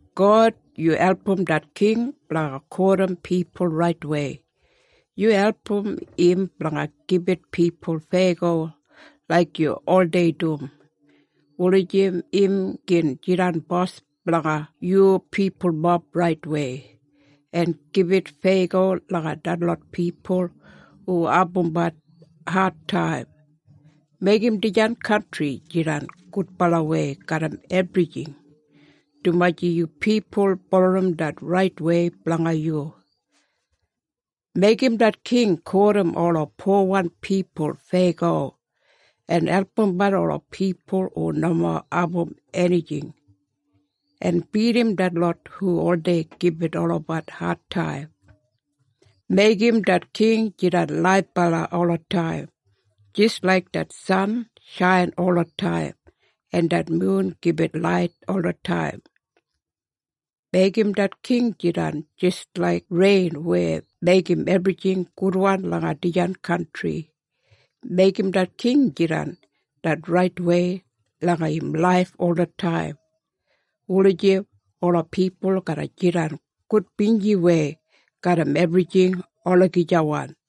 God, yu album det king blanga kotim pipul raitwei. Yu album im blanga gibit pipul feyago laik yu oldei dum, wulijim im gin jidan bos blanga yu pipulmob raitwei, en gibit feyago langa detlot pipul hu abumbat adtaim. Meigim dijan kantri jidan gudbalawei garram ebrijing, dumaji yu pipul bulurrum det raitwei blanga yu. Meigim det king kotim ola powan pipul feyago, en albumbat ola pipul hu nomo abum enijing, en bidim detlot hu oldei gibit olabat adtaim. Meigim det king jidan laibala olataim, jis laik det san shain olataim, en det mun gibit lait olataim. Meigim det king jidan jis laik rein weya meigim ebrijing gudwan langa dijan kantri. Meigim det king jidan det raitwei langa im laif olataim, wulijim ola pipul garra jidan gudbinjiwei garram ebrijing olagijawan.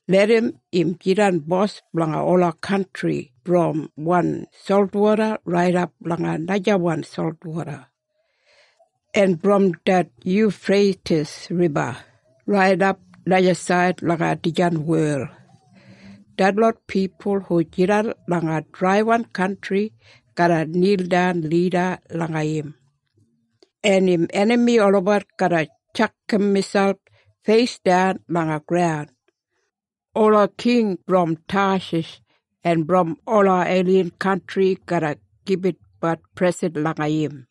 Larram im jidan bos blanga ola kantri brom wan solwoda raidap langa najawan solwoda, en brom det Yufreitis Riba raidap najasaid langa dijan wel. Detlot pipul hu jidan langa drai kantri garra nildan lida langa im, en im enami olabat garra tjakam miselp feisdan langa graun. Ola king brom Tashish en brom ola ailin kantri garra gibitbat presen langa im.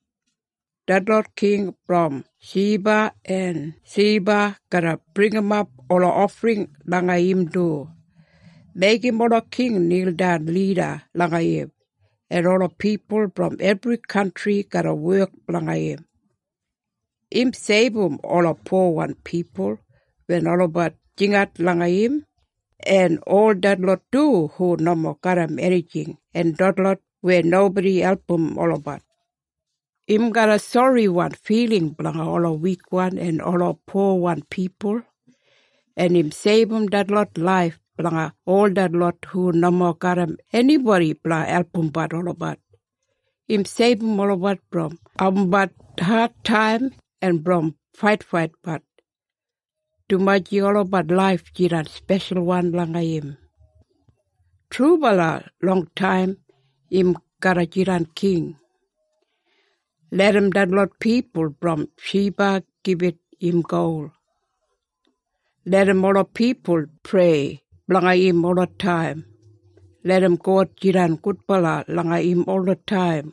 Detlot king brom Shiba en Seba garra bringimap ola ofring langa im du. Meigim ola king nildan lida langa im, en ola pipul brom ebri kantri garra wek blanga im. Im seibum ola powan pipul wen olabat jingat langa im, en ol detlot du hu nomo garram enijing en detlot weya nobodi album olabat. Im garram soriwan filing blanga ola wikwan en ola powan pipul, en im seibum detlot laif blanga ol detlot hu nomo garram enibodi blanga albumbat olabat. Im seibum olabat brom abumbat adtaim en brom faitfaitbat, dumaji olabat laif jidan speshalwan langa im. Trubala, longtaim im garra jidan king! Larram detlot pipul brom Shiba gibit im gol. Larram ola pipul prei blanga im olataim. Larram God jidan gudbala langa im olataim.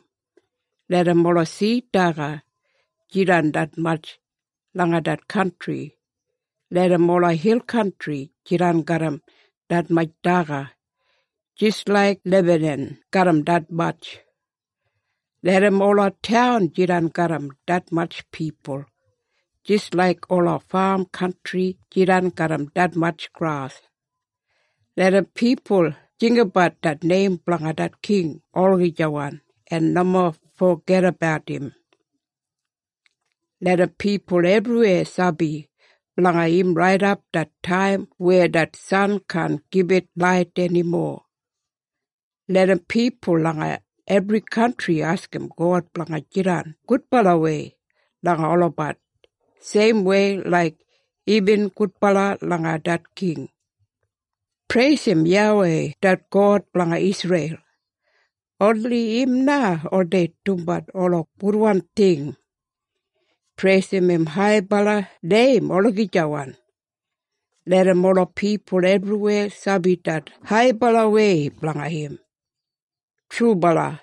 Larram ola sid daga jidan detmatj langa det kantri. Larram ola hil kantri jidan garram detmatj daga, jis laik Lebanan garram detmatj. Larram ola taun jidan garram detmatj pipul, jis laik ola fam kantri jidan garram detmatj gras. Larram pipul jinggabat det neim blanga det king olagijawan, en nomo fogedabat im. Larram pipul ebriweya sabi blanga im raidap det taim weya det san kaan gibit lait enimo. Larram pipul langa ebri kantri askim God blanga jidan gudbalawei langa olabat, seimwei laik imbin gudbala langa det king. Preisim YAWEI det God blanga Isreil! Oni im na oldei dumbat ola gudwan ting. Preisim im haibala neim olagijawan. Larram ola pipul ebriweya sabi det haibalawei blanga im. Yuwai! Trubala!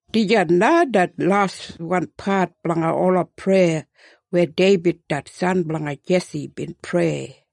Dijan na det laswanpat blanga ola preya weya Deibid det san blanga Jesi bin prei.